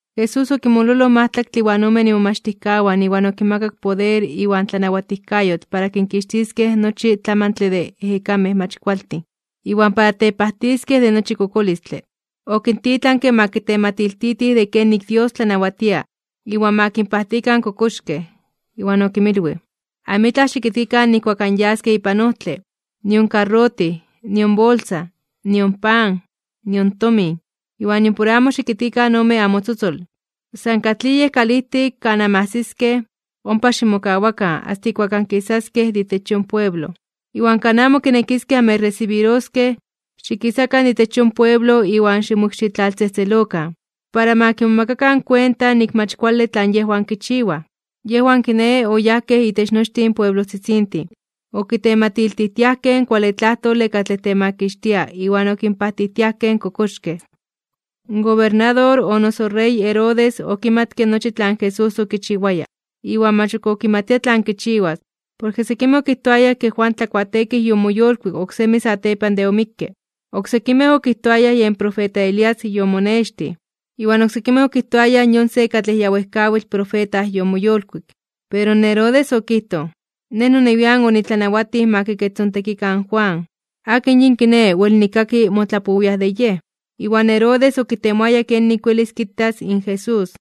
Jesús okinmololoj in majtlaktle iwan omen imomachtijkawan iwan okinmakak poder iwan tlanawatijkayotl para kinkixtiskej nochi tlamantle de ejekamej mach kualtin, iwan para tepajtiskej de nochi kokolistle. Okintitlanke ma kitematiltitij de kenik Dios tlanawatia, iwan ma kinpajtikan in kokoxkej. Iwan okinmilwij: ―Amitlaj xikitkikan nijkuak anyaskej ipan ojtle, nion karrotij, nion bolsa, nion pan, nion tomin, iwan nimpor amo xikitkikan ome namotzotzol. San katlij yej kalijtik kan anmajsiskej, ompa ximokawakan asta ijkuak ankisaskej de itech yon pueblo. Iwan kan amo kinekiskej anmechresibiroskej, xikisakan de itech yon pueblo iwan ximokxitlaltzejtzelokan, para ma kimomakakan kuenta nik mach kuale tlan yejwan kichiwaj. Yejwan, kiné, oyajkej itech nochtin pueblojtzitzintin, okitematiltijtiajkej in kuale tlajtole katlej temakixtia iwan okinpajtijtiajkej in kokoxkej. In gobernador o noso rey Herodes okimatke nochi tlan Jesús okichiwaya, iwan mach ok okimatia tlan kichiwas, porke sekimej okijtoayaj ke Juan Tlakuateekij yomoyolkuik oksemi satepan de omikke. Oksekimej okijtoayaj yen profeta Elías yomonextij. Iwan oksekimej okijtoayaj yon se katlej ya wejkawitl profeta yomoyolkuik. Pero Herodes okijtoj: ―Nej nonewian onitlanawatij ma kikechtzontekikan in Juan. ¿Akin yin, kiné, wel nikkaki motlapowiaj de yej? Iwan Herodes okitemoaya kenik welis kitas in Jesús.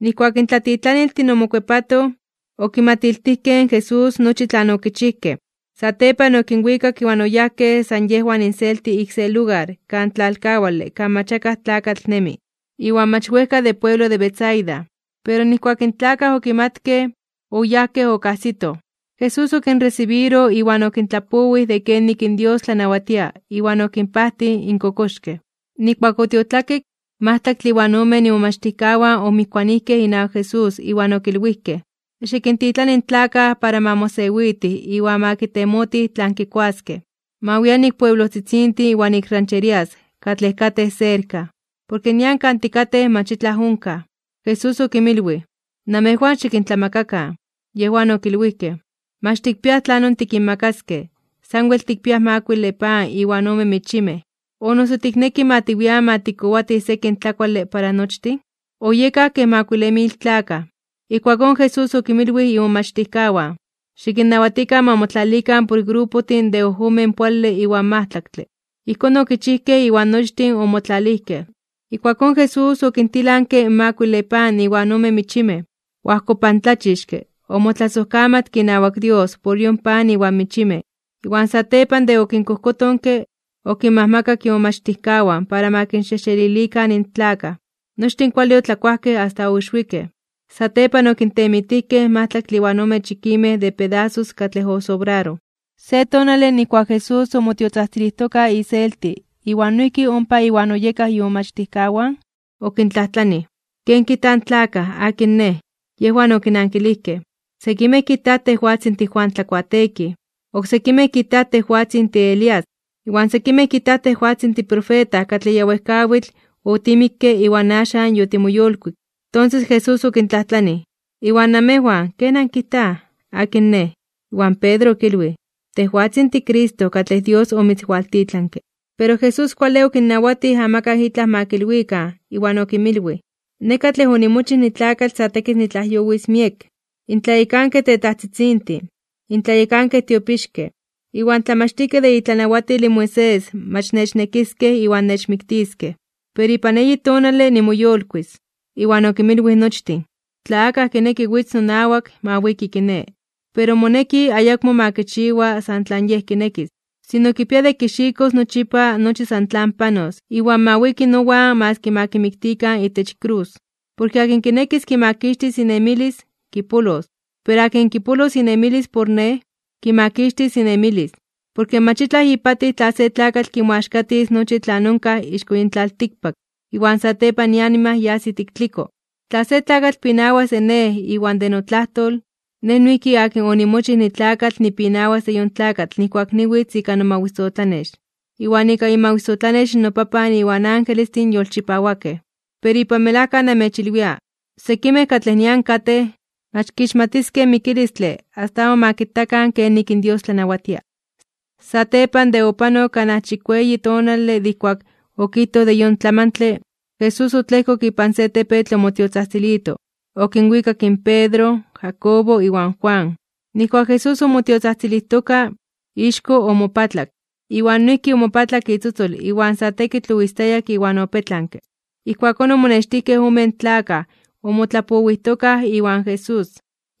Nijkuak in tlatitlaniltin omokuepatoj, okimatiltijkej in Jesús nochi tlan okichijkej. Satepan okinwikak iwan oyajkej san yejwan inselti ik se lugar kan tlalkawale kan mach akaj tlakatl nemi, iwan mach wejka de pueblo de Betsaida. Pero nijkuak in tlakaj okimatkej, oyajkej okajsitoj. Jesús okinresibiroj iwan okintlapowij de kenik Dios tlanawatia iwan okinpajtij in kokoxkej. Nijkuak otiotlakik, in majtlaktle iwan omen imomachtijkawan omijkuanijkej inawak Jesús iwan okilwijkej: ―Xikintitlani in tlakaj para ma mosewitij iwan ma kitemotij tlan kikuaskej. Ma wian ik pueblojtzitzintin iwan ik rancherías katlej katej serka, porke nian kan tikatej mach itlaj onkaj. Jesús okinmilwij: ―Namejwan xikintlamakakan. Yejwan okilwijkej: ―Mach tikpiaj tlanon tikinmakaskej, sanwel tikpiaj makuile pan iwan ome michimej. ¿O noso tikneki ma tiwian ma tikkowatij sekin tlakuale para nochtin? Oyekaj kej makuile mil tlakaj. Ijkuakón Jesús okinmilwij imomachtijkawan: ―Xikinnawatikan ma motlalikan por grupojtin de ojomen poale iwan majtlaktle. Ijkón okichijkej iwan nochtin omotlalijkej. Ijkuakón Jesús okintilanke in makuile pan iwan ome michimej. Oajkopantlachixke, omotlasojkamatke inawak Dios por yon pan iwan michimej, iwan satepan de okinkojkotonke, okinmakak imomachtijkawan para ma kinxejxelilikan in tlakaj. Nochtin kuale otlakuajkej asta oixwikej. Satepan okintemitijkej majtlaktle iwan ome chikimej de pedasos katlej osobraroj. Se tonale nijkuak Jesús omotiotzajtzilijtoka iselti iwan noijki ompa Iwan oyekaj imomachtijkawan, okintlajtlanij: ―¿Ken kijta in tlakaj? ¿Akin Nej? Yejwan okinankilijkej: ―Sekimej kijtaj tejwatzin tiJuan Tlakuateekij. Oksekimej kijtaj tejwatzin tiElías, iwan sekimej kijtaj tejwatzin tiprofeta katlej ya wejkawitl otimikke iwan axan yotimoyolkuik. Tonses Jesús okintlajtlanij: ―Iwan namejwan, ¿ken ankijtaj? ¿Akin Nej? Iwan Pedro okilwij: ―Tejwatzin tiCristo katlej Dios omitzwaltitlanke. Pero Jesús kuale okinnawatij amakaj itlaj ma kilwikan. Iwan okinmilwij: ―Nej katlej onimochij nitlakatl sa tekitl nitlajyowis miek. In tlayekankej tetajtzitzintin, in tlayekankej tiopixkej, iwan tlamachtijkej de itlanawatil in Moisés mach nechnekiskej iwan nechmiktiskej. Pero ipan eyi tonale nimoyolkuis (nimoyolitis). Iwan okinmilwij nochtin: ―Tla akaj kineki witz nonawak, ma wiki kiné, pero moneki ayakmo ma kichiwa san tlan yej kinekis. Sino kipia de kixikos nochipa nochi san tlan panos iwan ma wiki nowan maski ma kimiktikan itech krus. Porke akin kinekis kimakixtis inemilis, kipolos, pero akin kipolos inemilis por Nej, kimakixtis inemilis. Porke mach itlaj ipatij tla se tlakatl kimoaxkatis nochi tlan onkaj ixko yin tlaltikpak, iwan satepan ianima yas ijtik tliko. Tla se tlakatl pinawas de Nej iwan de notlajtol, Nej noijki akin onimochij nitlakatl nipinawas de yon tlakatl nijkuak niwitz ika nomawisotlanex, iwan ika imawisotlanex in noPapan iwan angelestin yolchipawakej. Pero ipan melajka namechilwia, sekimej katlej nian katej, mach kixmatiskej in mikilistle asta amo ma kitakan kenik in Dios tlanawatia. Satepan de opanok kanaj chikueyi tonale de ijkuak okijtoj in yon tlamantle, Jesús otlejkok ipan se tepetl omotiotzajtzilito, okinwikak in Pedro, Jacobo iwan Juan. Nijkuak Jesús omotiotzajtzilijtoka, ixko omopatlak, iwan noijki omopatlak itzotzol iwan sa tekitl oistayak iwan opetlanke. Ijkuakón omonextijkej omen tlakaj omotlapowijtokaj iwan Jesús.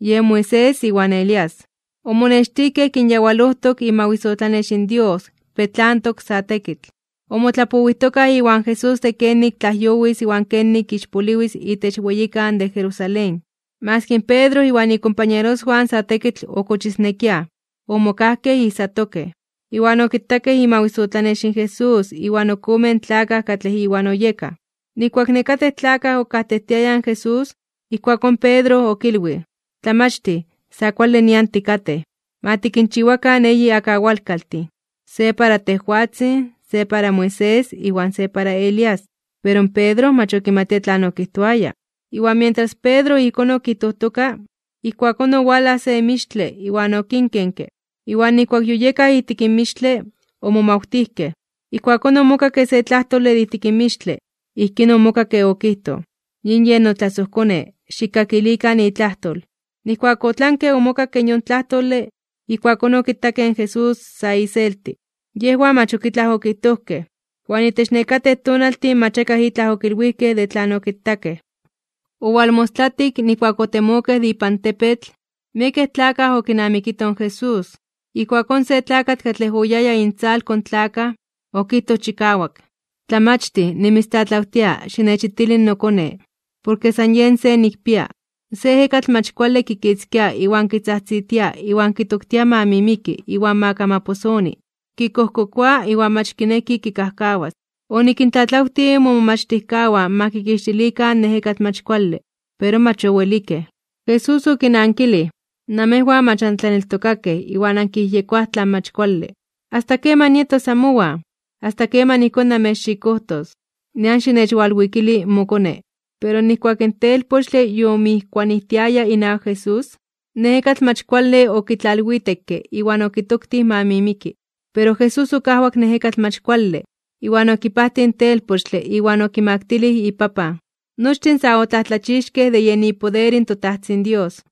Yen Moisés iwan Elías. Omonextijkej kinyawalojtok imawisotlanex in Dios petlantok sa tekitl, omotlapowijtokaj iwan Jesús de kenik tlajyowis iwan kenik ixpoliwis itech weyikan de Jerusalén. Maski in Pedro iwan ikompañeroswan sa tekitl okochisnekiaj, omokajkej ijsatokej, iwan okitakej imawisotlanex in Jesús iwan ok omen tlakaj katlej Iwan oyekaj. Nijkuak nekatej tlakaj okajtejtiayaj in Jesús, ijkuakón Pedro okilwij: ―Tlamachtij, sa kuale nian tikatej. Ma tikinchiwakan eyi akawalkaltin, se para tejwatzin, se para Moisés iwan se para Elías. Pero Pedro mach okimatia tlan okijtoaya. Iwan mientras Pedro ijkón okijtojtoka, ijkuakón owalaj se mixtle iwan okinkenke, iwan nijkuak yoyekaj ijtik in mixtle, omomawtijkej. Ijkuakón omokakke se tlajtole de ijtik mixtle. Ijkín omokakke okijtoj: ―Yin yen notlasojKone, xikkakilikan itlajtol. Nijkuak otlanke omokakke yon tlajtole, ijkuakón okitakej in Jesús sa iselti. Yejwan mach ok itlaj okijtojkej, iwan itech nekatej tonaltin mach akaj itlaj okilwijkej de tlan okitakej. Owalmostlatik, nijkuak otemokej de ipan tepetl, miekej tlakaj okinamikitoj in Jesús. Ijkuakón se tlakatl katlej oyaya intzalko in tlakaj, okijtoj chikawak: ―Tlamachtij, nimitztlatlawtia xinechitili nokone, porke san yen se nikpia. Se ejekatl mach kuale kikitzkia iwan kitzajtzitia iwan kitoktia ma mimiki iwan ma kamaposoni. Kikojkokoa iwan mach kineki kikajkawas. Onikintlatlawtij momomachtijkawan ma kikixtilikan in ejekatl mach kuale, pero mach owelikej. Jesús okinankilij: ―¡Namejwan mach antlaneltokakej iwan ankiyejyekoaj tlan mach kuale! ¿Asta keman nietos amowan? ¿Asta keman ijkón namechxikojtos? Nian xinechwalwikili mokone. Pero nijkuak in telpochtle yomijkuanijtiaya inawak Jesús, in ejekatl mach kuale okitlalwitekke iwan okitoktij ma mimiki. Pero Jesús okajwak in ejekatl mach kuale, iwan okipajtij in telpochtle iwan okimaktilij ipapan. Nochtin sa otlajtlachixkej (omomajmawtijkej) de yen ipoder in toTajtzin Dios.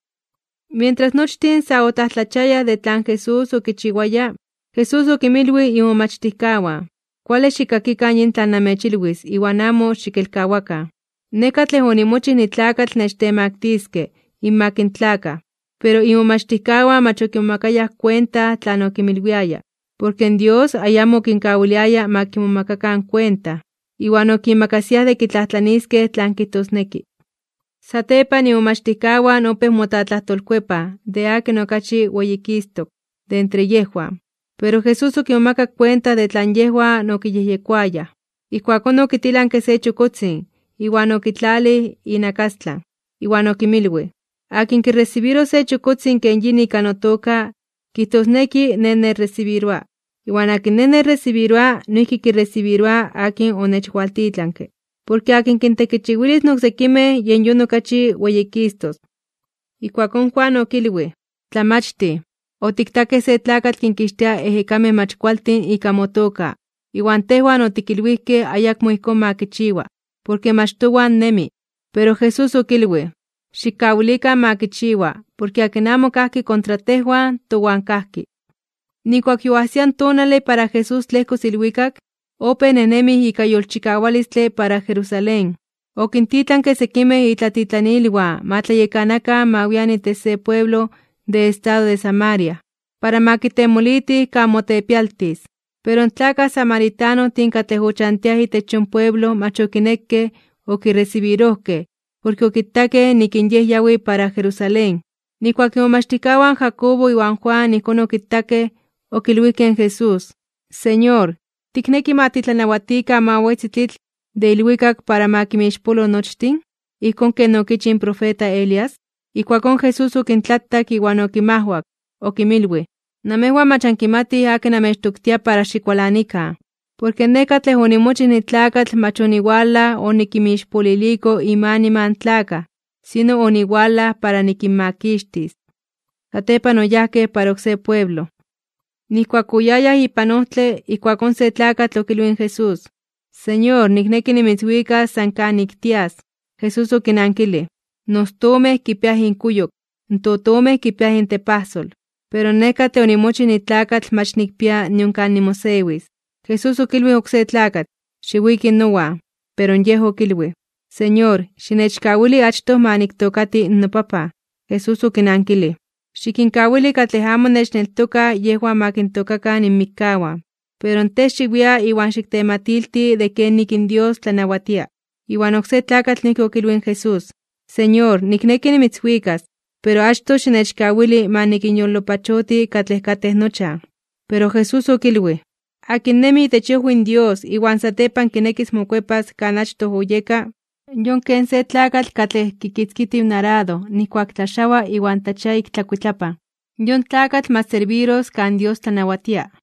Mientras nochtin sa otlajtlachiayaj de tlan Jesús okichiwaya, Jesús okinmilwij imomachtijkawan: ―Kuale xikkakikan yin tlan namechilwis iwan amo xikelkawakan: Nej katlej onimochij nitlakatl nechtemaktiskej (nechtemaktiliskej) inmak in tlakaj. Pero imomachtijkawan mach okimomakayaj kuenta tlan okinmilwiaya, porke Dios ayamo okinkawiliaya ma kimomakakan kuenta. Iwan okimakasiaj de kitlajtlaniiskej tlan kijtosneki. Satepan imomachtijkawan opéj motlatlajtolkuepaj de akin okachi weyikistok (weyititok) de entre yejwan. Pero Jesús okimomakak kuenta de tlan yejwan okiyejyekoayaj. Ijkuakón okitilanke se chokotzin, iwan okitlalij inakastlan. Iwan okinmilwij: ―Akin kiresibiros se chokotzin ken yin ika notoka, kijtosneki Nej nechresibiroa. Iwan akin Nej nechresibiroa, noijki kiresibiroa akin onechwaltitlanke. Porke akin kintekichiwilis in oksekimej, yen yon okachi weyikistos. Ijkuakón Juan okilwij: ―Tlamachtij, otiktakej se tlakatl kinkixtia ejekamej mach kualtin ika motoka. Iwan tejwan otikilwijkej ayakmo ijkón ma kichiwa, porke mach towan nemi. Pero Jesús okilwij: ―Xikkawilikan ma kichiwa, porke akin amo kajki kontra tejwan, towan kajki. Nijkuak yoajsia in tonale para Jesús tlejkos ilwikak, opéj nejnemi ika yolchikawalistle para Jerusalén. Okintitlanke sekimej itlatitlanilwan ma tlayekanakan ma wian itech se pueblo de estado de Samaria, para ma kitemolitij kan motepialtis (mokalotis). Pero in tlakaj samaritanojtin katlej ochantiaj itech yon pueblo mach okinekej okiresibirojkej porke okitakej nik in Yej yawi para Jerusalén. Nijkuak imomachtijkawan Jacobo iwan Juan ijkón okitakej, okilwijkej in Jesús: ―Señor, ¿tikneki ma titlanawatikan ma wetzi tlitl de ilwikak para ma kinmixpolo nochtin, ijkón ken okichij in profeta Elías? Ijkuakón Jesús okintlatak iwan okinmajwak, okinmilwij: ―Namejwan mach ankimatij akin namechtoktia para xikualanikan. Porke Nej katlej onimochij nitlakatl mach oniwalaj onikinmixpoliliko inmanima in tlakaj, sino oniwalaj para nikinmakixtis. Satepan oyajkej para oksé pueblo. Nijkuak oyayaj ipan ojtle, ijkuakón se tlakatl okilwij in Jesús: ―Señor, nikneki nimitzwikas san kanik tias. Jesús okinankilij: ―In ostomej (astomej) kipiaj inkuyok, in totomej kipiaj intepajsol. Pero Nej katlej onimochij nitlakatl mach nikpia nion kan nimosewis. Jesús okilwij oksé tlakatl: ―Xiwiki nowan. Pero yej okilwij: ―Señor, xinechkawili achtoj ma niktookati nopapan. Jesús okinankilij: ―Xikinkawili katlej amo nechneltokaj yejwan ma kintookakan inmikkawan. Pero tej, xiwia iwan xiktematilti de kenik in Dios tlanawatia. Iwan oksé tlakatl noijki okilwij in Jesús: ―Señor, nikneki nimitzwikas, pero achtoj xinechkawili ma nikinyolopachoti katlej katej nochan. Pero Jesús okilwij: ―Akin nemi itech iojwi in Dios iwan satepan kinekis mokuepas kan achtoj oyeka, yon ken se tlakatl katlej kitzkijtiw in arado nijkuak tlaxawa iwan tlachia ik ikuitlapan. Yon tlakatl mach serbiros kan Dios tlanawatia.